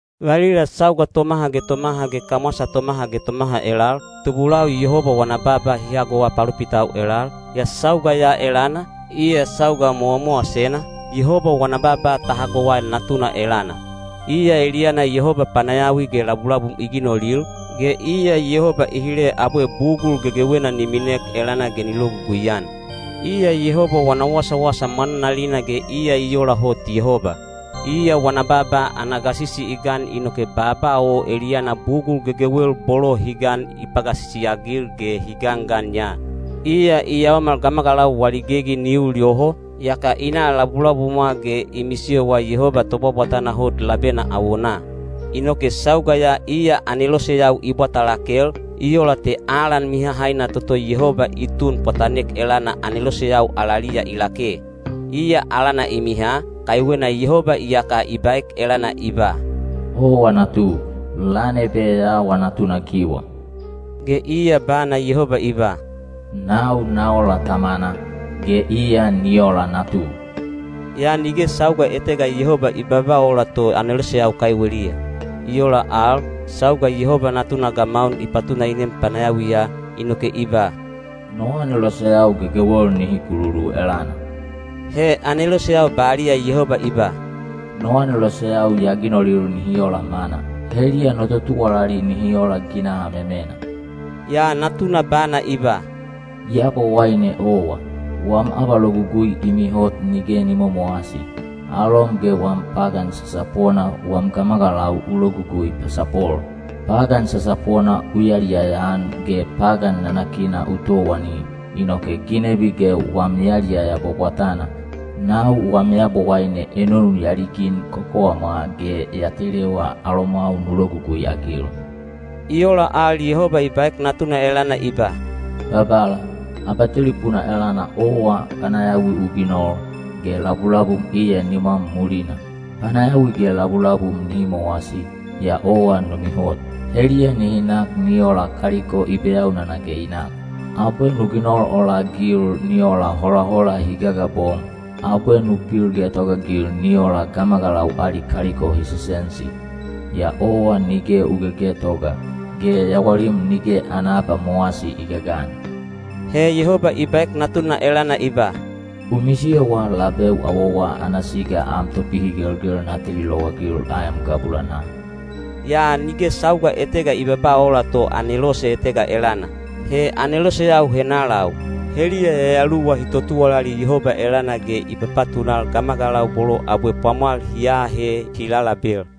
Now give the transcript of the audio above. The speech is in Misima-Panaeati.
Valila sauga tomaha ge tomaha ge kamwasa tomaha ge tomaha elal, tubulau Yehoba wana baaba hi hagowa palopitau elal, yaa sauga ya elana, iya sauga mowamowasena, Yehoba wana baaba ta hagowa Natuna elana. Iya eliyana Yehoba panayawi ge labulabum i ginolil, ge iya Yehoba i hile abwe bugul gegewena ni minek elana ge ni logugui-an. Iya Yehoba wana wasawasa mwananalina ge iya i ola hot Yehoba. Iya wana baaba ana gasisi i gan inoke baaba o eliyana bugul gegewel bolo hi gan i pagasisi-agil ge hi gangan ya. Iya i yaomal gamagalau wali gegi ni ul yoho, yaka i na labulabumwa ge i misiyowa Yehoba Tobwabwatana Hot labena awonaa. Inoke sauga ya iya aneloseyau i bwata lakel, i ola te alan mihahaina toto Yehoba i tun pwatanek elana aneloseyau alaliya i lake. Iya alana i miha, kaiwena Yehoba iyaka i baek elana i ba: “Owa natu; lan ebe ya awa natunagiwa.” Ge iya bana Yehoba i ba: “Nau na ola Tamana, ge iya ni ola Natu.” Yaa nige sauga etega Yehoba i babaa ola to aneloseyau kaiweliya. I ola al, sauga Yehoba Natuna gamaun i patuna i nem panayawiya, inoke i ba, “No aneloseyau gegewel nihi kululu elana.” He aneloseyau baliya Yehoba i ba: “No aneloseyau ya ginolil nihi ola mana, heliya no totuwalali nihi ola ginaha memena.” Yaa Natuna bana i ba: Yabowaine owa, wam abalogugui i mihot nige ni momowasi; alom ge wam pagan sasapona wam gamagalau u logugui pasapol. Pagan sasapona u yaliyaya-an ge pagan nanakina u towani, inoke ginebi ge wam yaliyaya bwabwatana, nau wam Yabowaine enonu ya ligin kokowamwa ge ya telewa alomwau nu logugui-agil. I ola al Yehoba i baek Natuna elana i ba: Babala, abatelipuna elana owa panayawi u ginol, ge labulabum iya nimwam mulina. Panayawi ge labulabum nihi mowasi, yaa owa nu mihot. Heliya nihi nak ni ola kaliko i beyaunana ge i nak. Abwe nu ginol ola-agil ni ola holahola hi gagabom, abwe nu pil getogaagil ni ola gamagalau ali kaliko hi sesensi. Yaa owa nige u gegetoga, ge yawalim nige ana abamowasi i gagan. He Yehoba i baek Natuna elana i ba: “U misiyowa labeu awowa ana siga am topihigelgel na teli lowagil aem gabulanaa.” Yaa nige sauga etega i babaa ola to anelose etega elana. He aneloseyau henalau? Heliya yayaluwa hi totuwalali Yehoba elana ge i papatunal gamagalau bolo abwe pwamwal hi aahe hi lalabel.